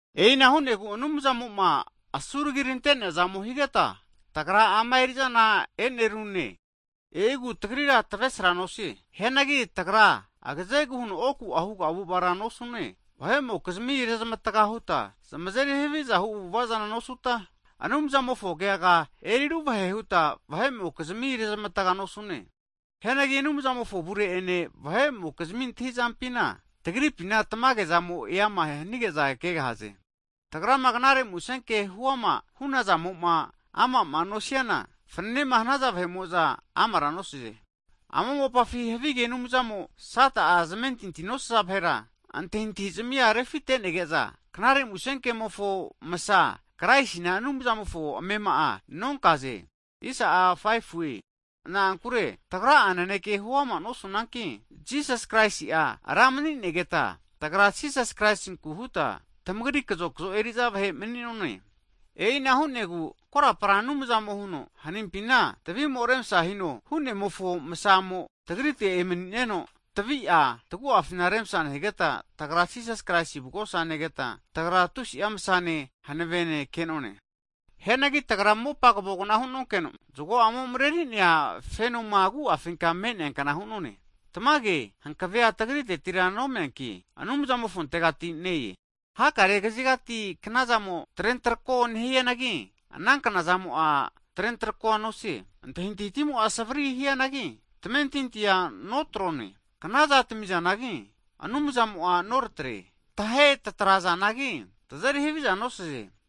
E'ina hu'negu Anumzamo'ma asuragi rante'neazamo higeta, tagra ama erizana e'nerune, e'igu tagrira tavesra nosie. Hianagi tagra agazegu huno oku'a huga avu'avara nosune, vahe'mokizmi rezmatga huta zmazeri havizahu avu'avazana nosuta, Anumzamofo kegaga eriruvahe huta vahe'mokizmia rezmatga nosune. Hianagi Anumzamofo avure ene vahe'mokizmi antahizampina, tagripina tamage'zamo eama hanigeza kegahaze. Tagrama knare musenke huama hunazamo'ma ama'ma nosiana, fananema hanaza vahe'mo'za amara nosaze. Ama mopafi havige anumzamo, Sata'a zamentinti nosaza vahera antahintahizamia refinetege'za, knare musenkemofo msa Kraisina Anumzamofo amema'a nonkaze. Na'ankure tagra'a nanekea huama nosunanki, Jisas Kraisi'a Ra mani'negeta, tagra Jisas Kraisinku huta tamagri kazokzo eriza vahe mani'none. E'ina hu'negu korapara Anumzamo huno, hanimpina tavimo'a remsa hino hu'nemofo masamo, tagrite emani'neno tavi'a taguafina remsa nehigeta, tagra Jisasi Kraisi avugosa negeta, tagra tusi'a msane hanavene ke'noe. Hianagi tagra mopa kavogna hunonkeno zgo'amo mareri'nea fenomo agu'afinka me'neakna hu'none. Tamage hankevea tagritegatira nomeanki, Anumzamofontegati ne-e. Hakare kazigati knazamo'a trentarako nehianagi, ana knazamo'a trentarako nosie, antahintahitimo'a savri hianagi tamentintia notrone. Knaza tamizanagi, Anumzamo'a noratre, tahe tatarazanagi, tazeri haviza nosaze.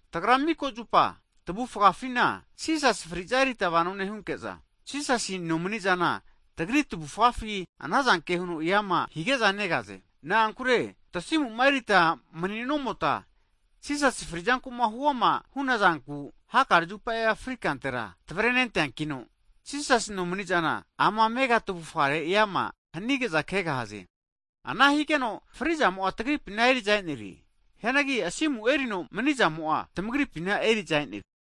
Tagra mika zupa, tavufgafina Jisasi fri'za erita vano nehunke'za, Jisasi nomani'zana, tagri tavufafi anazanke huno eama hige'za negaze. Na'ankure tasimu'ma erita mani'nomota Jisasi fri'zankuma huama hunazanku, hakare zupa fri kantera tavrenenteankino, Jisasi nomani'zana, ama amega tavufgare eama hanige'za kegahaze. Ana higeno fri'zamo'a tagripina eriza e'nerie. Hianagi asimu erino manizamo'a tamagripina eriza e'nerie.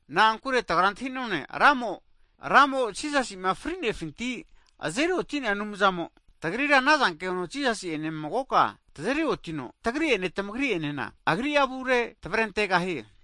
Na'ankure tagra antahi'none, Ramo, Jisasi'ma fri'nefinti azeri oti'nea Anumzamo, tagrira anazanke huno Jisasi ene magoka tazeriotino, tamagri ene tagri'enena Agri'a avurera tavrentegahie.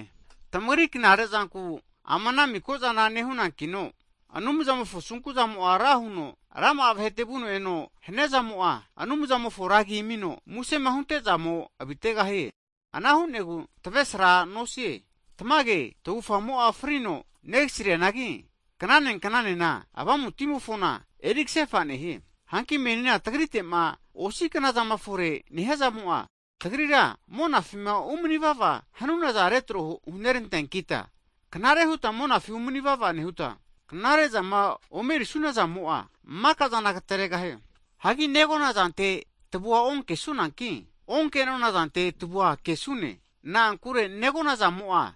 Tamagri knarezanku, ama ana miko zana nehunankino, Anumzamofo asunkuzamo ra huno rama'a vahete vuno eno hania'zamo'a, Anumzamofo ra agi amino musema hunte'zamo avitegahie. Ana hu'negu tavresra nosie. Tamage tavufgamo'a frino negasrianagi, knane knanena avamutimofona erikasefa nehie. Hanki meni tagritema osi knazama fore nehiazamo'a, tagrira monafima umani vava hanunaza retro huneranteankita, knare huta monafi umani vava nehuta, knarezama omerisunazamo'a, makazana agateregahie. Hagi negonazantera tavua onkesunanki, onke'nonazante tavua kesune. Na'ankure negona zamoa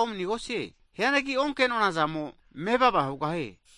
omanegosie, hianagi okenona zamo'a mevava hugahie.